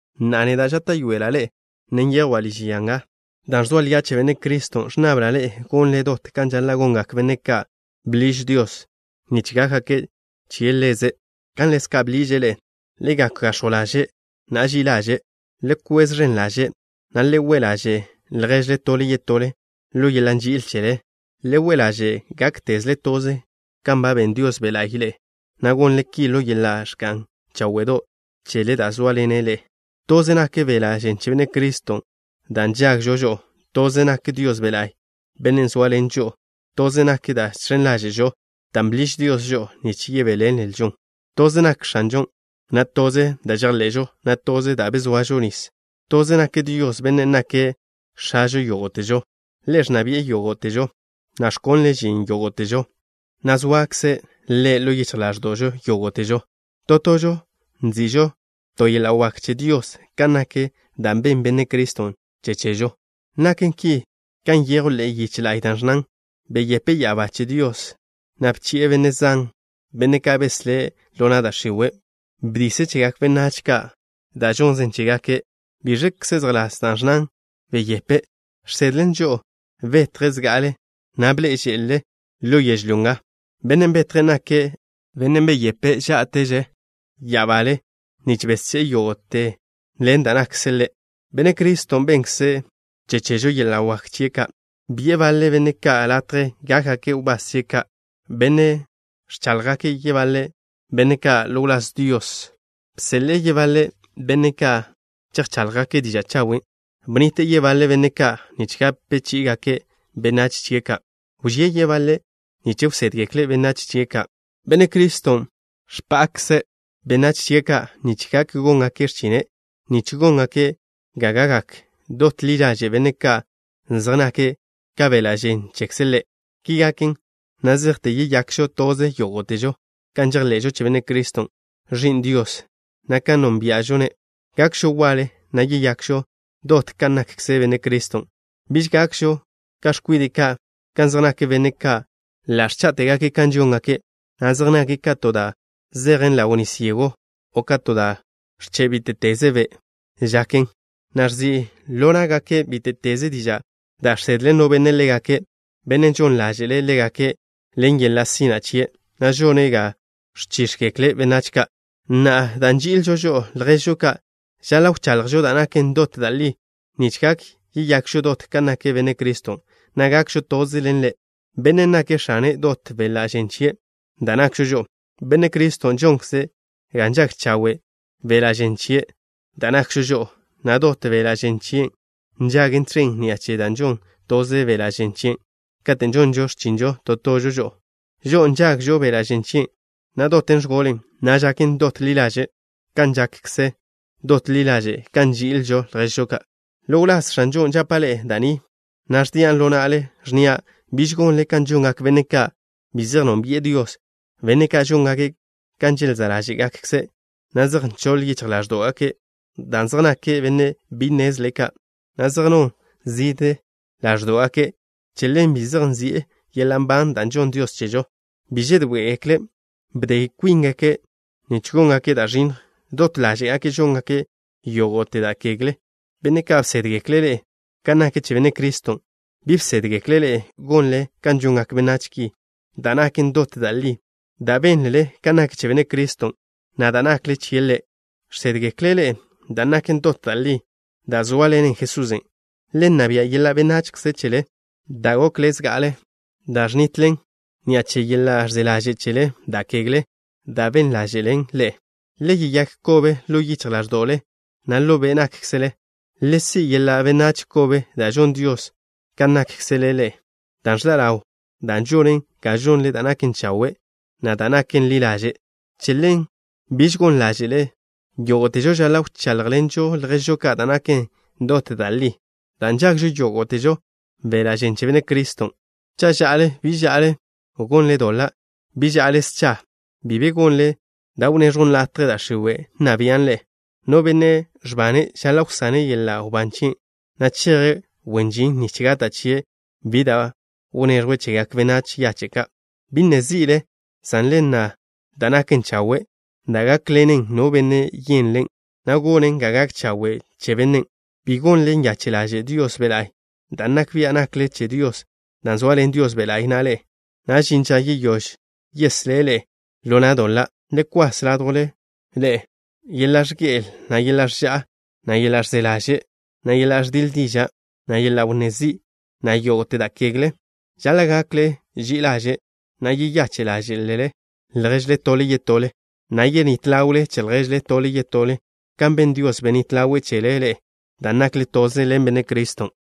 Na'a, neda' žáta'yoela' ḻe'e, ne nyejwa' liž ya nga dan' ẕzoa lia' che Benne' Criston'. Ẕnnabla' ḻe'e gonle dot kan žaḻa' gongak benne' ka' bḻiž Dios nich gákgake' che Ḻeze', kan ḻezka' bḻiže' ḻe'e. Le gak gax̱jw ḻaže', na' ži'i ḻaže'. Le kwez ẕen ḻaže', na' le we' ḻaže' lježle tole yetole ḻo yeḻa' nži'il chele. Le we' ḻaže' gáktezle toze kan ba ben Dios Be' La'y ḻe'e, na' gonle ki ḻo yeḻa' ẕga'n cháwe'do' chele da' zóaḻenen ḻe'e. Toze nak beḻa' žen che Benne' Criston' da' nžagžo žo'o. Toze nak Dios Be' La'y, Bennen' zóaḻene' žo'o. Toze nak da' žx̱en ḻáže'žo, dan' bḻiž Dios žo'o nich yebéḻenlžon. Toze nak X̱anžon', na' toze da' žejḻe'žo, na' toze da' bezoažo nis. Toze nak Dios, Bennen' nake' X̱ažo yógo'težo. Ḻe' ẕnna bi'e yógo'težo, na' ẕkonle' žin yógo'težo, na' zoakze' Ḻe' ḻo yichj ḻáẕdo'žo yógo'težo. To tožo nzi'žo to yeḻa' wak che Dios kan nak da' benn Benne' Criston' che chežo. Naken ki kan nyejw ḻe'e yiche la'y, da' ẕnnan: Beyepe' ya'abá che Dios, na' bchi'e benne' zan, benne' ka' beslé' ḻo na' da' x̱iwe'. Bdise' chegak benách ka' da' žonnze' chégake'. ¿Biẕkze zejḻás dan' ẕnnan: “beyepe'?” Žsedlen žo'o betje' zga'ale, na' bḻe'e že'le ḻo yežlyó nga. Bennen' betje' nake' Bennen' beyepe' žá'teže ya'abale nich besché'e yógo'te ḻen da' nakkze' Ḻe'. Benne' Criston' bennkze' che chežo yeḻa' wak chie' ka': Bi'e baḻe benne' ka' latje gákgake' wbás chie' ka'. Bene' ga ẕchaḻjgak yebaḻe benne' ka' ḻo wláz Dios. Bseḻe'e yebaḻe benne' ka' chejcháḻjgake' diža' chawen'. Bnnite' yebaḻe benne' ka' nich gape chí'igake' benách chie' ka'. Wžíe' yebaḻe' nich wsédgekle' benách chie' ka'. Benne' Criston' bpa'kze' benách chie' ka' nich gak góngake' x̱chine', nich góngake' ga gakgak dot ḻi ḻaže' benne' ka' zej nake' ka beḻa' žen chekze' Ḻe'. Ki gaken na' zejte yeyakžo toze yógo'težo kan žejḻe'žo che Benne' Criston', Ẕi'n Dios, na' kan nónbia'žo-ne'. Gakžo waḻe, na' yeyakžo dot kan nakkze Benne' Criston'. Biž gakžo ka x̱kwide' ka', kan zej nak benne' ka' ḻa' ẕchá'tegake' kan žóngake', na' zej nake' ka to da' zejen ḻaw nis yego, o ka to da' ẕche' bíte'teze be' žaken, na' ẕzi' ḻo ná'gake' bíte'teze diža' da' žsedle no benne' ḻégake', bennen' žon ḻáže'le' ḻégake' ḻen yeḻa' sina' chie', na' žone' ga ẕchíx̱gekle benách ka'. Na'a, dan' nži'ilžo žo'o lježžo ka', žaḻa' wchaḻjžo da' naken dot da' li nich gak yeyakžo dot kan nak Benne' Criston', na' gakžo toze ḻen Ḻe', Bennen' nake' X̱ane dot beḻa' žen chie', da' nakžo žo'o. Benne' Criston' žonkze' ga nžag chawe' beḻa' žen chie', da' nakžo žo'o, na' dot beḻa' žen chien' nžagen tẕen ni'a che da' žon toze beḻa' žen chien'. Kate' žonžo x̱chinžo to tožo žo'o, žo'o na' nžagžo beḻa' žen chien', na' doten ẕgolen, na' žaken dot ḻi ḻaže', kan zej žakže dot ḻi ḻaže' kan nži'ilžo lježžo ka'. Ḻo wláz X̱anžon' žapa' ḻe'e da' ni, na' ẕdian' ḻo na'le, ẕnnia': biž gonle kan žongak benne' ka' bi zej nónbi'e Dios, benne' ka' žóngake' kan želzá' ḻáže'gakze', na' zej nchoḻ yichj ḻáẕdo'gake'. Dan' zej nake' benne' bi nnezle ka', na' zej non zižje ḻáẕdo'gake', che ḻen bi zej nzi'e yeḻa' nban da' žonn Dios chežo. Bi žedoé'egekle'. Bde kwíngake' nich góngake' da' ẕinnj. Dot ḻáže'gake' žóngake' yógo'te da' kegle. Benne' ka' bsédgekle' ḻe'e kan nak che Benne' Criston', bi bsédgekle' ḻe'e gonle kan žongak benách ki. Da' naken dot da' li da' bénlele kan nak che Benne' Criston', na' da' nakle chie' Ḻe', žsédgeklen ḻe'e da' naken dot da' li da' zóaḻenen Jesusen'. Le nna bia' yeḻa' benachze chele da' gokle zga'ale, dan' ẕnitlen ni'a che yeḻa' ẕze ḻaže' chele da' kegle dan' ben ḻáže'len ḻe'e. Le yeyák kobe ḻo yichj ḻáẕdo'le, na' ḻo be' nákkzele. Le si' yeḻa' benách kobe da' žon Dios kan nakkze' Ḻe', dan' ẕḻa' ḻawn dan' žonen ga žonle da' naken chawe', na' da' naken ḻi ḻaže'. Che ḻen, biž gon ḻáže'le. Yógo'težo žaḻa' wcháḻjḻenžo lježžo ka' da' naken dot da' li, dan' nžagžo yógo'težo beḻa' žen che Benne' Criston'. Cha' ža'le, bi žaḻa' gonle doḻa'. Bi ža'le scha. Bi be gonle da' wnné x̱jon latje da' x̱iwe' nna bian' ḻe'e. No benne' ẕbane' žaḻa' wsane' yeḻa' wbán chie', na' cheje' wen žin nich gata' chie' bi da' wneẕjwe' chegak benách yache' ka'. Bi nne zi'le, san le nna da' naken chawe', da' gákḻenen no benne' yenlen', na' gonen ga gak chawe' che bennen'. Bi gonle nyache' ḻaže' Dios Be' La'y, dan' nak bia' nakle che Dios dan' zoaḻen Dios Be' La'y na' ḻe'e, na' žin ža yeyóž yeslé' ḻe'e ḻo na' doḻa'. Le kwas ládjwle ḻe'e: Yeḻa' ẕge'el, na' yeḻa' ẕža'a, na' yeḻa' ẕze ḻaže', na' yeḻa' ẕdiḻe diža', na' yeḻa' wnné zi', na' yógo'te da' kegle. Žaḻa' gakle ži'i ḻaže', na' yeyache' ḻáže'lele lježle tole yetole, na' yenít ḻawle che lježle tole yetole, kan ben Dios, benít ḻawe' chele ḻe'e dan' nakle toze ḻen Benne' Criston'.